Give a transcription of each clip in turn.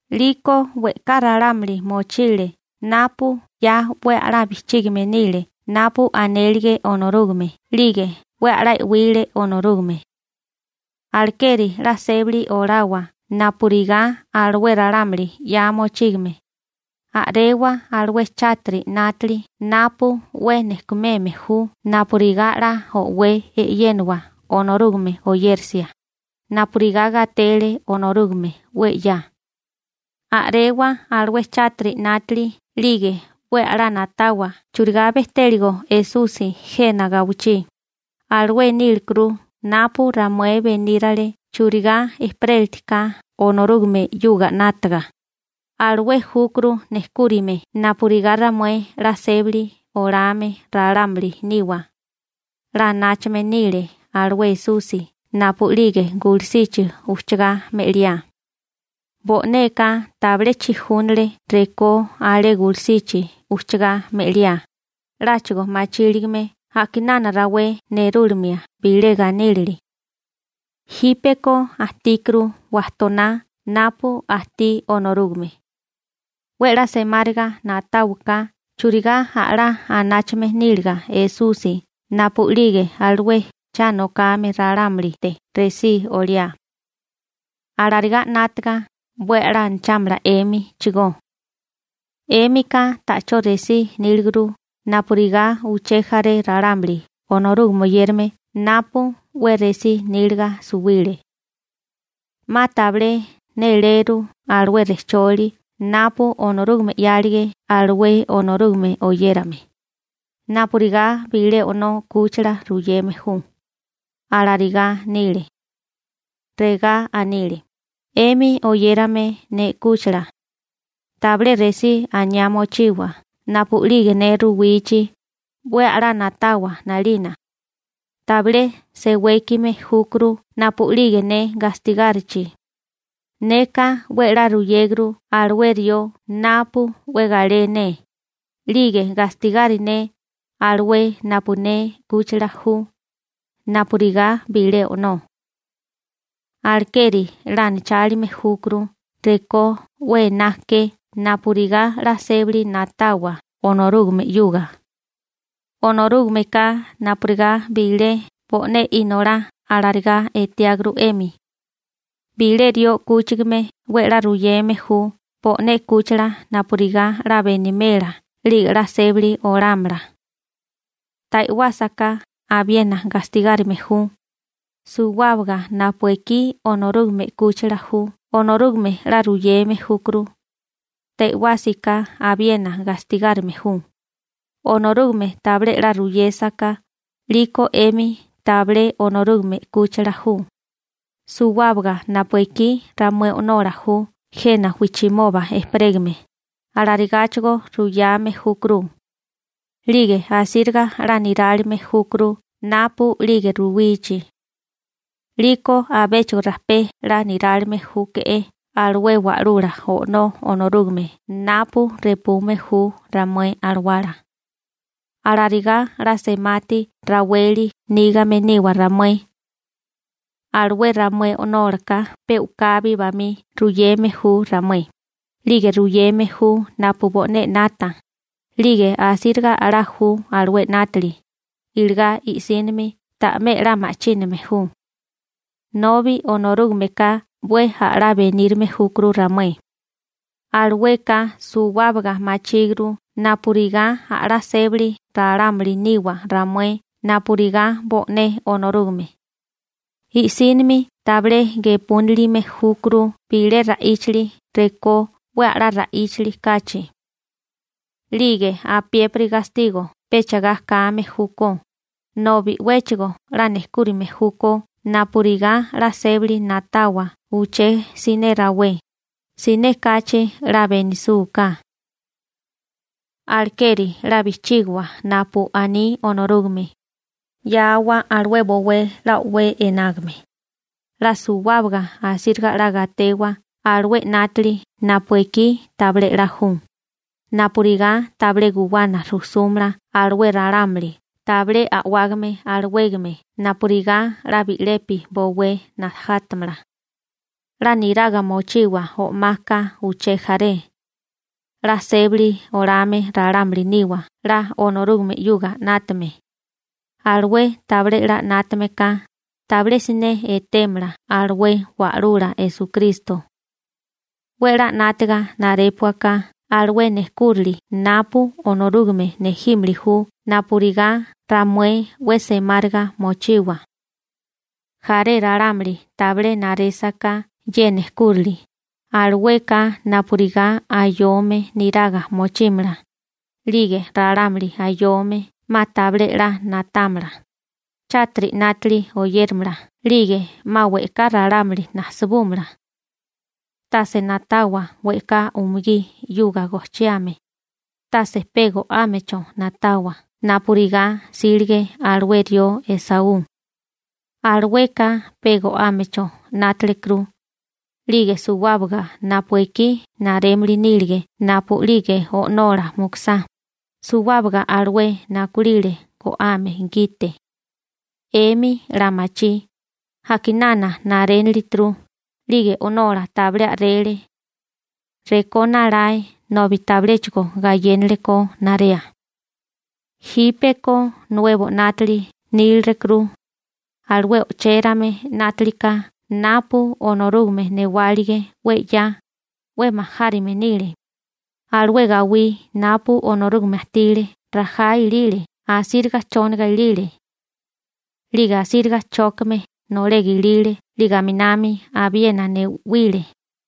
'Liko we'ká ralámuli mochile napu 'ya 'we a'lá bijchígame nile napu anélige Onorúgame 'lige 'we a'lá e'wile Onorúgame. Alekeri 'la sébali olawa napurigá alué ralámuli 'ya mochígame. A'rewa alué chátiri 'nátili napu 'we nejkumeme ju napurigá 'la o'wé e'yénawa Onorúgame oyérisia, napurigá gatele Onorúgame 'we 'ya. A'rewa alué chátiri 'nátili 'lige 'we a'lá na'tawa churigá bejtéligo Esusi jena gawichí, alué nílekuru napu ramué benírale churigá ejperélitiká Onorúgame 'yuga 'nátaga, alué júkuru nejkúrime napurigá ramué 'la sébali olame ralámuli niwa. 'La anáchame nile alué Esusi napu'lige gulusichi ujchagá me'liá. Bo'neka tabilé chijúnale rekó alé gulusichi ujchagá me'liá, 'láchigo machíligame a'kinana rawé nerúlimia bilé ganílili. Jípeko ajtíkuru wajtoná napu ajtí Onorúgame. 'We 'la semáriga na'táwaká churigá a'lá anáchame níliga Esusi napu'lige alué cha nokame ralámulite resí oliá. Alarigá 'nátaga 'we a'lá anachámala 'émichigó. 'Émika ta'chó resí níliguru napurigá uché jaré ralámuli Onorúgame oyérame napu 'we resí níliga suwile. 'Ma tabilé néléru alué rejcholi napu Onorúgame 'yálige alué Onorúgame oyérame. Napurigá bilé o'nó 'kúchila ruyeme ju, alarigá nile. Regá anile: 'Emi oyérame ne 'kúchila. Tabilé resí aniá mochiwa napu'lige ne ruwichi, 'we a'lá na'tawa 'nalina. Tabilé sewékime júkuru napu'lige ne gastigárichi. Neka 'we 'la ruyéguru alué rió napu 'we galé ne, 'lige gastigari ne alué napu ne 'kúchila ju, napurigá bilé o'nó. Alekeri 'la anachálime júkuru rekó 'we ená ke napurigá 'la sébali na'tawa Onorúgame 'yuga. Onorúgameka napurigá bilé bo'né inolá alarigá etiáguru 'emi. Bilé rió 'kúchigame 'we 'la ruyeme ju bo'né 'kúchila napurigá 'la benimela 'lige 'la sébali olámala. Ta e'wásaká abiena gastigárime ju. Suwábaga napu ekí Onorúgame 'kúchila ju Onorúgame 'la ruyeme júkuru. Ta e'wásiká abiena gastigárime ju. Onorúgame tabilé 'la ruyésaká, 'liko 'emi tabilé Onorúgame 'kúchila ju. Suwábaga napu ekí ramué o'nola ju jena wijchimoba ejperégame, alarigá ruyame júkuruchigó. 'Lige asíriga 'la nirálime júkuru napu'lige ruwichi. 'Liko abéchigo rajpé 'la nirálime júkuru alué Wa'lula O'nó Onorúgame napu repume ju ramué alawala. Alarigá 'la semati raweli nígame niwa ramué. Alué ramué o'nólaka pe u'kabi bamí ruyeme ju ramué, 'lige ruyeme ju napu bo'né 'nata, 'lige asíriga a'lá ju alué 'nátili, iligá i'sínimi ta'mé 'la ma'chíname ju. Nobi Onorúgameka 'we a'lá benírime júkuru ramué. Alueka suwábaga machíguru napurigá a'lá sébali ralámuli niwa ramué napurigá bo'né Onorúgame. I'sínimi tabilé gepúnilime júkuru bilé ra'íchali rekó 'we a'lá ra'íchali kachi. 'Lige apiépiri gastigo pecha ga kame júkó, nobi 'wéchigo 'la nejkúrime júkó napurigá 'la sébali na'tawa uché siné rawé, siné kachi 'la benisúká. Alekeri 'la bijchígiwa napu aní Onorúgame. 'Yáawa alué bowé 'la o'wé enágame. 'La suwábaga asíriga 'la gatewa alué 'nátili napu ekí tabilé 'la ju, napurigá tabilé guwana rujsúmala alué ralámuli tabilé a'wágame alawégame napurigá 'la bi'lepi bowé najátamala. 'La niraga mochiwa o'maka uché jaré. 'La sébali olame ralámuli niwa 'la Onorúgame 'yuga 'nátame. Alué tabilé 'la 'nátame ka, tabilé siné etémala alué Wa'lula Esukristo. 'We 'la 'nátiga narépuaká alué nejkúrali napu Onorúgame nejímili ju napurigá ramué 'we semáriga mochiwa. Jaré ralámuli tabilé narésaká ye nejkúrali, alueka napurigá ayome niraga mochímala, 'lige ralámuli ayome 'ma tabilé 'la na'támala, chátiri 'nátili oyéramala 'lige 'ma we'ká ralámuli najsabúmala. Tase na'tawa we'ká umugí 'yuga gojchiame, tase pe go'ámecho na'tawa napurigá 'sílige alué rió Esaú. Alueka pe go'ámecho 'nátelekuru, 'lige suwábaga napu ekí narémili nílige napu'lige o'nola mukusá, suwábaga alué nakulile go'ame gite. 'Emi 'la machí, a'kinana narénilituru, 'lige o'nola tabilé a'rele. Rekó nalae nobi tabiléchigo gayénalekó narea. Jípeko nuebo 'nátili nílerukuru. Alué o'chérame 'nátilika napu Onorúgame newálige 'we 'ya, 'we majárime nile. Alué gawí napu Onorúgame ajtile rajá ilile. Asíriga chóniga ilile, 'lige asíriga chókame nolega ilile 'lige aminami abiena ne'wile.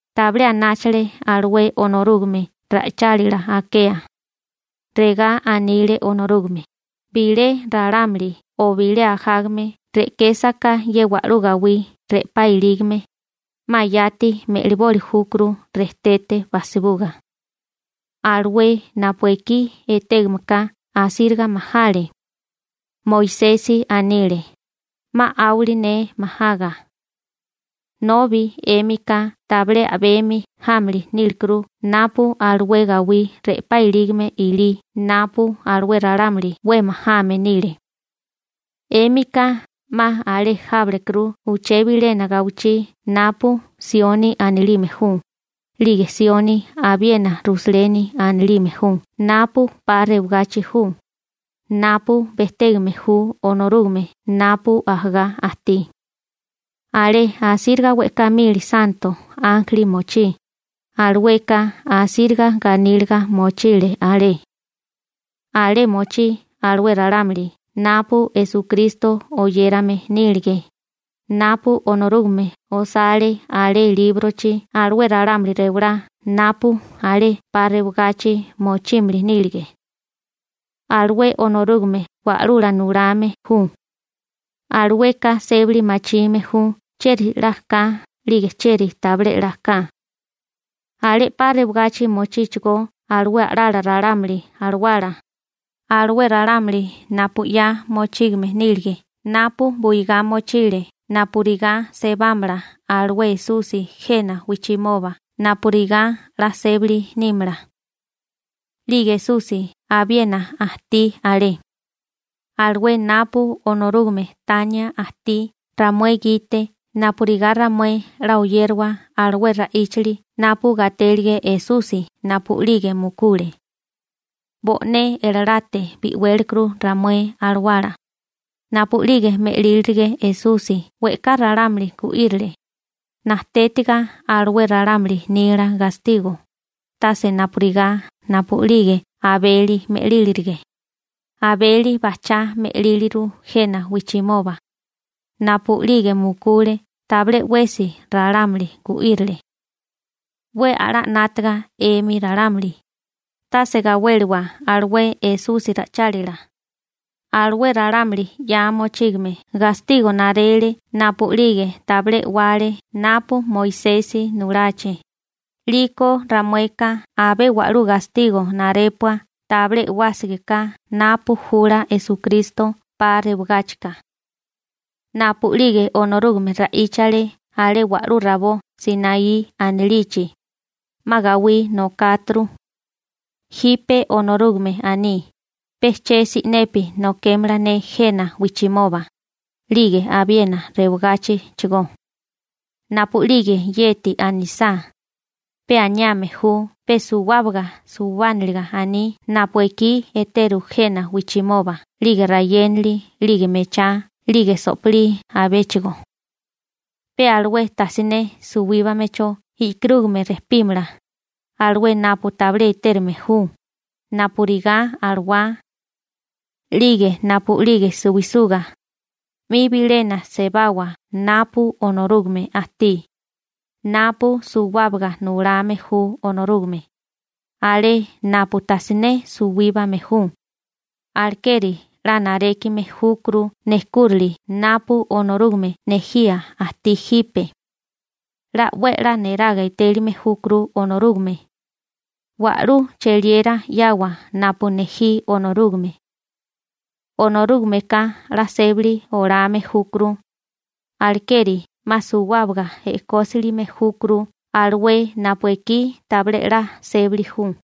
Tabilé anáchale alué Onorúgame ra'ichálila akea. Regá anile Onorúgame: «Bilé ralámuli o bilé ajágame re'késaká ye wa'lú gawí re'pá ilígame, 'ma yati me'liboli júkuru rejtete bajsibuga.» Alué napu ekí etégame ka asíriga majale. Moisesi anile: «'Ma 'áwali ne majaga.» Nobi 'émika tabilé a'bemi jámili nílikuru napu alué gawí re'pá ilígame ilí napu alué ralámuli 'we majame nile. 'Émika 'ma alé jábalekuru uché bilena gawichí napu Sioni anilime ju, 'lige Sioni abiena Rusaleni anilime ju napu 'pa rewagachi ju, napu bejtégame ju Onorúgame napu ajagá ajtí. Alé asíriga we'ká mili santo ánjeli mochí, alueka asíriga ganíliga mochí alé. Alé mochí alué ralámuli napu Esukristo oyérame nílige, napu Onorúgame osale alé líbrochi alué ralámuli rewalá napu alé 'pa rewagachi mochímili nílige. Alué Onorúgame Wa'lula Nulame ju. Alueka sébali machime ju chieri 'la ka 'lige chieri tabilé 'la ka. Alé 'pa rewagachi mochíchigó alué a'lala ralámuli alawala, alué ralámuli napu 'ya mochígame nílige napu buigá mochile napurigá sebámala alué Esusi jena wijchimoba napurigá 'la sébali nímala. 'Lige Esusi abiena ajtí alé, alué napu Onorúgame tania ajtí ramué gite napurigá ramué 'la oyérawa alué ra'íchali napu gatélige Esusi napu'lige mukule. Bo'né elalate bi'wélekuru ramué alawala. Napu'lige me'lílirige Esusi we'ká ralámuli gu'írile, najtétiga alué ralámuli nila gastigo, tase napurigá napu'lige Abeli me'lírilige. Abeli bajchá me'líliru jena wijchimoba. Napu'lige mukule tabilé 'wesi ralámuli gu'írile. 'We a'lá 'nátaga 'emi ralámuli. Tase gawéliwa alué Esusi ra'ichálila. Alué ralámuli 'ya mochígame gastigo narele napu'lige tabilé e'wale napu Moisesi nulachi, 'liko ramueka abé wa'lú gastigo narépua tabilé e'wásiká napu jula Esukristo 'pa rewagáchika. Napu'lige Onorúgame ra'íchale alé wa'lú rabó Sinaí anilichi, 'ma gawí nokáturu. Jipe Onorúgame aní: «Pe che si'nepi nokémala ne jena wijchimoba, 'lige abiena rewagáchichigó.» Napu'lige yeti anisá, pe aniame ju pe suwábaga suwábaniliga aní napu ekí eteru jena wijchimoba 'lige rayénali 'lige mechá 'lige so'pilí abechigó. Pe alué tajsiné suwíbamecho e'karúgame rejpímala, alué napu tabilé etérume ju, napurigá alawá. 'Lige napu'lige suwisuga, 'mi bilena sebawa napu Onorúgame ajtí, napu suwábaga nulame ju Onorúgame, alé napu tajsiné suwíbame ju, alekeri 'la narékime júkuru nejkúrali napu Onorúgame nejía ajtí jipe. 'La 'we 'la niraga etélime júkuru Onorúgame. Wa'lú cheliera 'yawa napu nejí Onorúgame. Onorúgameka 'la sébali olame júkuru, alekeri 'ma suwábaga e'kósilime júkuru alué napu ekí tabilé 'la sébali ju.